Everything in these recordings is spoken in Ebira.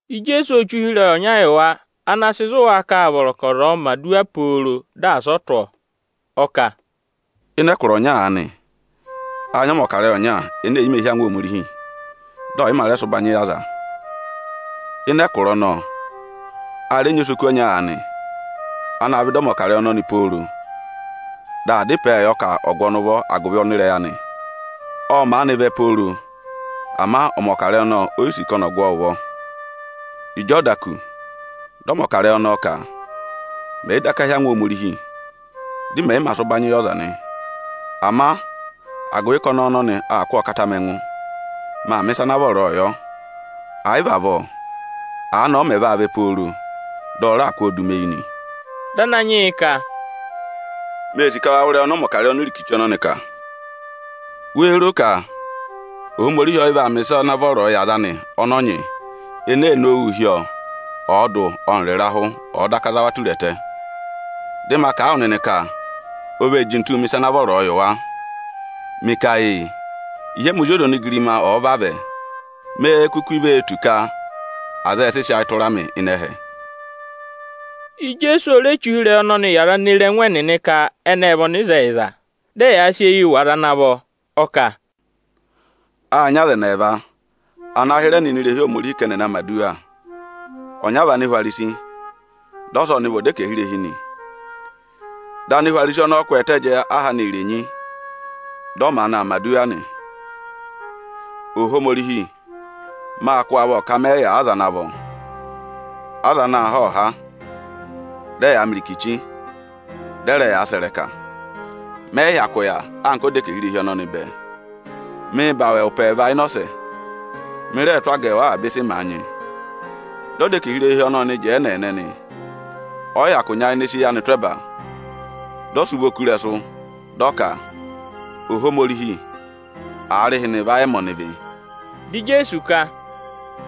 Ijeesu ô che ụhịrẹyị ọnya yị wa, ana sị zụ̀ wa ka â vọrọ ka ọza ọ̀ọ mẹ̀ aduwa pooro, dị asị ọ tụ́ ọọ. Ọ kà, “Ịnị ẹkụra ọnya aanị, â nyị ọmọkarẹyị ọnya ene è yi mē hí angwa Ohomorihi, dị ọ̀ yị mā rẹ sị ụbanyị yị aza. Ịnị ẹkụra ọnọọ, a rẹ nyị osoku ọnya aanị, anaā vẹ ịdị ọmọkarẹyị ọnọnị pooro, dị aa dá ịpẹẹ yọ ka ọ̀ gụ ọnị ụvọ agụvị ọnịrẹyị anị. Ộ maanị vẹ pooro, ama ọmọkarẹyị ọnọọ o yi sì ka ọnị ọ̀ gụ ọọ ụvọ. Ịjị ọ da kù, dị ọmọkarẹyị ọnọọ ka: ‘Mẹ̀ yị daka hí angwa Ohomorihi, dị mẹ̀ yị mā sị ụbanyị yị ọza nị, ama agụvị ka ọnẹẹ ọnọnị aa kụ́ ọọ kata mị ẹngụ, maa mẹ̀ ịsa ana vọrọọ yọ; ẹ̀ yị vị avọọ, aanị ọ mẹ̀ vaa vẹ pooro, dị ọ raà kụ́ ọọ du mi eyi nị.’” Dị Ananyị yị ka, “Mee sì ka wa wụ́ ịrẹyị ọnị ọmọkarẹyị onirikichi ọnọnị kà. Wéé ro ka Ohomorihi ọ yị vaa mẹ̀ ịsa ana vọrọọ yị aza anị ọnọọ nyị, ene ee nowuu hị́ ọọ, ọọdụ ọnịrị ịrahụ, ọ̀ọ daka za wa tura ẹtẹ? Dị ma kà a wụ nịnị ka o vee jintuu mẹ̀ ịsa ana vọrọọ yị wa. Mị ka ee, ịhị ẹmị Ozi ọza onigirima ọ̀ọ vavẹ, méé kuku vee tù ka aza ẹ sị sị ayị tụra mị ịnị ẹhẹ?” Ijeesu o re che ụhịrẹyị ọnọnị yị aza ene ee re ẹngụ ẹnịnị ka ẹnị ệ vị ọnịzẹyịza, dị ẹyaa sị eyii wụ̀ aza ana vọ. Ọ kà, “Â nyị aza ẹnị ẹẹva ana hịrẹ nọ ini irehi Ohomorihi ka ẹnị ẹ̀ na mẹ̀ aduwa. Ọnyara vị Anihwarisi, dị ọsa ọnị vị ọdẹkẹhirehi nị. Dị Anihwarisi ọnọọ kwẹẹtẹ jẹẹ aha anị irenyi, dị ọ maanị aa mẹ̀ aduwa nị ka: ‘Ohomorihi, mâ kụ́ wụ avọ ka mẹ yị yà aza ana vọ mẹ̀ yà: aza anaā họ́họ̀ha, dị ẹyaa mẹ irikichi, dị ẹ rẹ yaa sẹ̀ ịrẹka. Mẹ yị hyakụ yà anka ọdẹkẹhirehi ọnọnị bẹẹ. Mịị̄ za awẹ ụpẹ ẹẹva ịnị ọsẹ, mị rẹẹ̄ tụ́ agẹẹwụ avaba ịsị màa nyị.’ Dị ọdẹkẹhirehi ọnọọ ọnị jẹẹ ẹ́nẹẹnẹ nị. Ọ yị hyakụ nyayịnẹ sị eyi anị tụ́ ẹba. Dị ọ sị ụvọ kú ịrẹsụ, dị ọ ka: ‘Ohomorihi, aarịhịnị, vayị ẹmị ọnịvị!’” Dị Ijeesu ka, “Dị ma kà a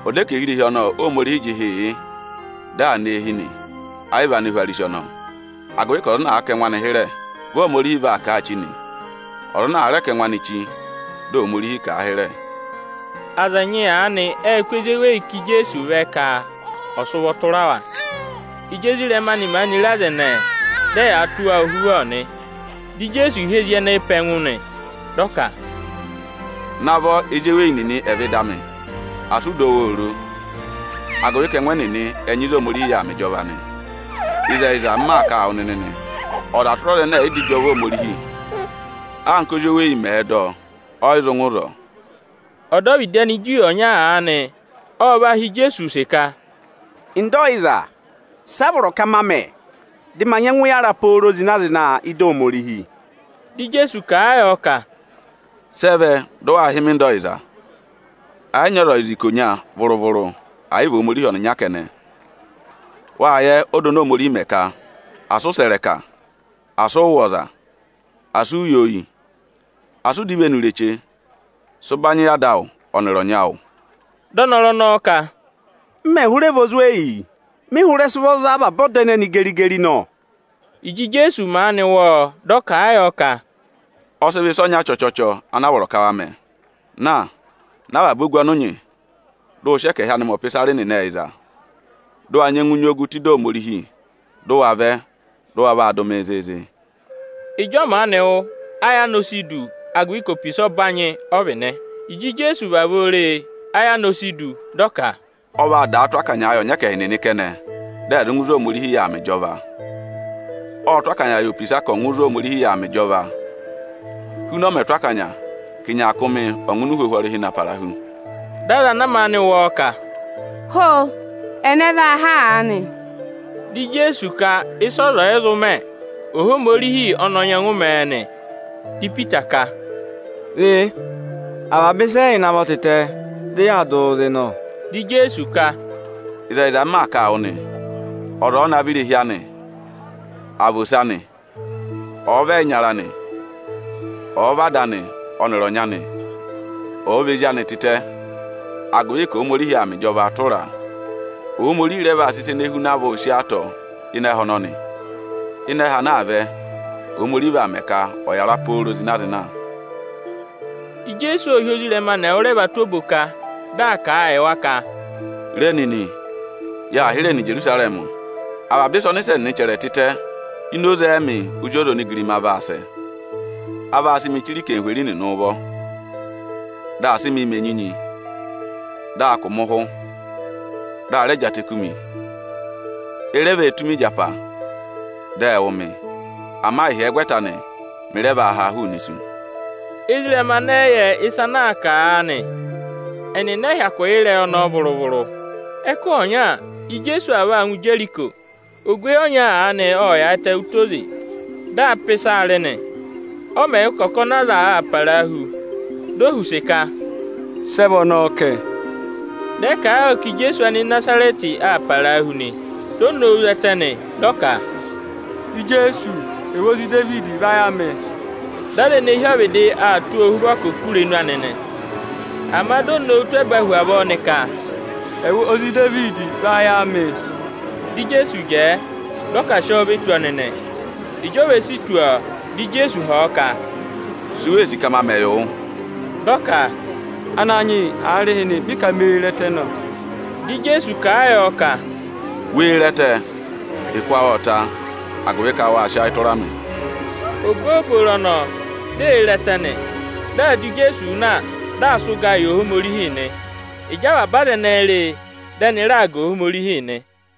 wụ nịnị ka ọdẹkẹhirehi ọnọọ Óhomorihi jị ịhị yị, dị aa nọ eehi nị, ẹ yị vị Anihwarisi ọnọọ. Agụvị ka ọza ana àa kà ẹngụ anị hịrẹ, vị Ohomorihi vaa kà a chí nị; ọza ana àa rẹ kà ẹngụ anị chí, dị Ohomorihi kà a hịrẹ.” Aza ẹnyị aanị ệ kụ́ ezi eweyi ká Ijeesu vẹ ka ọ̀ sị ụvọ tụra wa. Ịjị ezirẹma anị re aza ẹnẹẹ, dị ẹyaa tụ́ wa ohuvọ nị. Dị Ijeesu hị́ ezi ẹnẹẹ pe ẹngụ nị, dị ọ ka, “Navọ ezi eweyi nịnị ẹ̀ vẹ ịdị amị! Asị ụ dọ wa oro, agụvị ka ẹngụ ẹnịnị ẹ nyị ịzị Ohomorihi yà aa mẹ ịjọva nị. Ịzẹyịza, m maa kà a wụ nịnị nị, ọza tụra ọza ẹnẹ ẹ̀ yị dọ ịjọva Ohomorihi, anka ózi oweyi mẹ̀ẹ̄ dọ, ọ yị zụ ngụ ịzọọ.” Ọdọvịdị Aniju ọnya aanị ọ va họ̀ Ijeesu use ka: “Nda ọyịza, sị a vọrọ ka ma mẹ, dị ma nyẹngụ yàra pooro zịna-zịna ị́dị Ohomorihi?” Dị Ijeesu kà a yọ ka, “Sị ẹ vẹ dị waa hị́ mị Nda ọyịza? Ẹ yị nyị ọza ọyịza ikonya vụrụ-vụrụ, ẹ̀ yị vị Ohomorihi ọnịnya kẹnẹ. Wâ yẹ ọda oni Ohomorihi mẹ ka: Asị ụ sẹ̀ ịrẹka; Asị ụ wụ̀ ọza; Asị u yi oyi; Asị ụ dọ ivenu ireche; Sị ụbanyị yị ada awụ ọnịrị ọnyị awụ.” Dị ọnọrụ ọnọọ ka, “M mẹ̀ hụrẹ vị ozweyi, mị hụrẹ sị ụvọ za avaba ọda ẹnẹnị geri-geri nọ.” Ịjị Ijeesu maanị wụ́ ọọ, dị ọ kà a yọ ka, “Ọ sị vọ ịsa ọnya chọchọchọ ana a vọrọ ka wa mẹ: Na, ná avaba ogu ọnị ụ nyị, dị ụ wa sị ẹkẹhị anị mẹ ọpịsarị nịnị ẹyịza, dị ụ wa nyẹngụ nyị ogu tụ́ ịdị Ohomorihi; dị ụ wa vẹ, dị ụ wa vaa dụ mịị zịịzị!” Ịjị ọ maanị wụ́, ayị anị o si du, agụvị ka opisa ọbanyị ọ vị nị. Ịjị Ijeesu vavọọ re e, ayị anị o si du, dị ọ ka, “Ọ vaa daa tụ́ akanyaa yị ọnyẹkẹhị nịnị kẹnẹ, dị ẹ̀ ngụ ịzị Ohomorihi yà aa mẹ ịjọva. Ộ tụ́ akanya yị opisa ka ọ̀ ngụ ịzị Ohomorihi yà aa mẹ ịjọva, huna ọ mẹ̀ tụ́ akanya ka ịnyaakụmị ọ̀ ngụ ini uhwohwo ọrịhị na para hu.” Dị aza ana maanị wụ́ ọọ ka, “Ho! Ẹnẹ vaa há aanị?” Dị Ijeesu ka ịsị ọza ọ̀ yị zụ mẹ, Ohomorihi ọ nyẹngụ mẹẹ nị. Dị Ipita ka, “Re, avaba ịsa ẹ́yị navọ tịtẹ, dị yaa dụ wụụ zị nọ.” Dị Ijeesu ka, “Ịzẹyịza, m maa kà a wụ nị, ọza ọ̀ọ navọ irehi anị, àa vị ose anị, ọ̀ọ vị ẹyịnyara anị, ọ̀ọ vị ada anị ọnịrị ọnyị anị, ọ̀ọ vị ezi anị tịtẹ, agụvị ka Ohomorihi aa mẹ ịjọvaa tụra a, Ohomorihi rẹ vaa sị ịsa ene huna avọọ sí ọọ atọ ịnị ẹhẹ ọnọnị. Ịnị ẹhẹ ana aa vẹ, Ohomorihi vaa mẹ ka ọ̀ yàra pooro zịna-zịna.” Ijeesu ộ hị́ ezirẹma anị ẹwụrẹva tụ́ oboka, dị aa kà a yị wa ka, “Re nịnị, yaa hịrẹẹ nọ Ijerusarẹmị. Avaba ịsị ọnịsẹ nịnị chẹrẹ tịtẹ ini oze ẹmị Ozi ọza onigirima vaa sẹ. A vaa sị mịị chire anarịmadọwụ nịnị ụvọ, dị a sị mị mẹ̀ enyinyi, dị a kụ̀ mị ụhụ, dị a rẹ jị atẹ kú mi. E re vee tụ́ mi ịjapa, dị ẹ wụ̀ mị. Ama ịhyẹgwẹta anị, mị rẹ vaa haa hụụnị isu.” Ezirẹma anị ẹ yị yẹ ịsa ana aa kà aanị, ẹnịnị ẹ yị hyakụ yẹ ịrẹyị ọnọọ vụrụ-vụrụ. Ẹkụhị ọnya, Ijeesu aa vaa ngụ Ijeriko. Ogweyi ọnya aanị ộ yaayịtẹ ụtọ oze, dị aa pà ịsaa rị nị. Ọ mẹ̀ wụ́ ka ọkọnị aza aa parahu, di o họ̀ use ka, “Sị ẹ vị ọnọọ kẹ?” Dị ẹ kà a yọ ka Ijeesu Anịnazarẹtị aa parahu nị. Di o nowu zẹtẹ, dị ọ ka, “Ijeesu, ẹwụ Ozi Idevidi, vayị amị!” Dị aza ene hi ọvịdị aa tụ́ ọọ ohuvọ ka ọ̀ sị irenu anị kú oku nị. Ama di o nowu tụ́ ẹba hu avọọ nị ka, “Ẹwụ Ozi Idevidi, vayị amị!” Dị Ijeesu jẹẹ, dị ọ ka a sị ọọ ve tù ọnị nị. Ịjị o ve si tù ọọ, dị Ijeesu họ̀ ọ ka, “Si u wee sì ka ma mẹ yị wụ?” Dị ọ ka, “Ananyị yị, aarịhịnị mị ka mee re ẹtẹ nọ.” Dị Ijeesu kà a yọ ka, “Wee re ẹtẹ! Ụkụ awụ ộ ta, agụvị ka wâ sị ayị tụra mị.” Obooboro ọnọọ, di ee re ẹtẹ nị. Dị aa dụ Ijeesu na, dị aa sị ụgaa yị Ohomorihi nị. Ịjị avaba aza ẹnẹẹ re e, dị ẹnị raa ga Ohomorihi nị.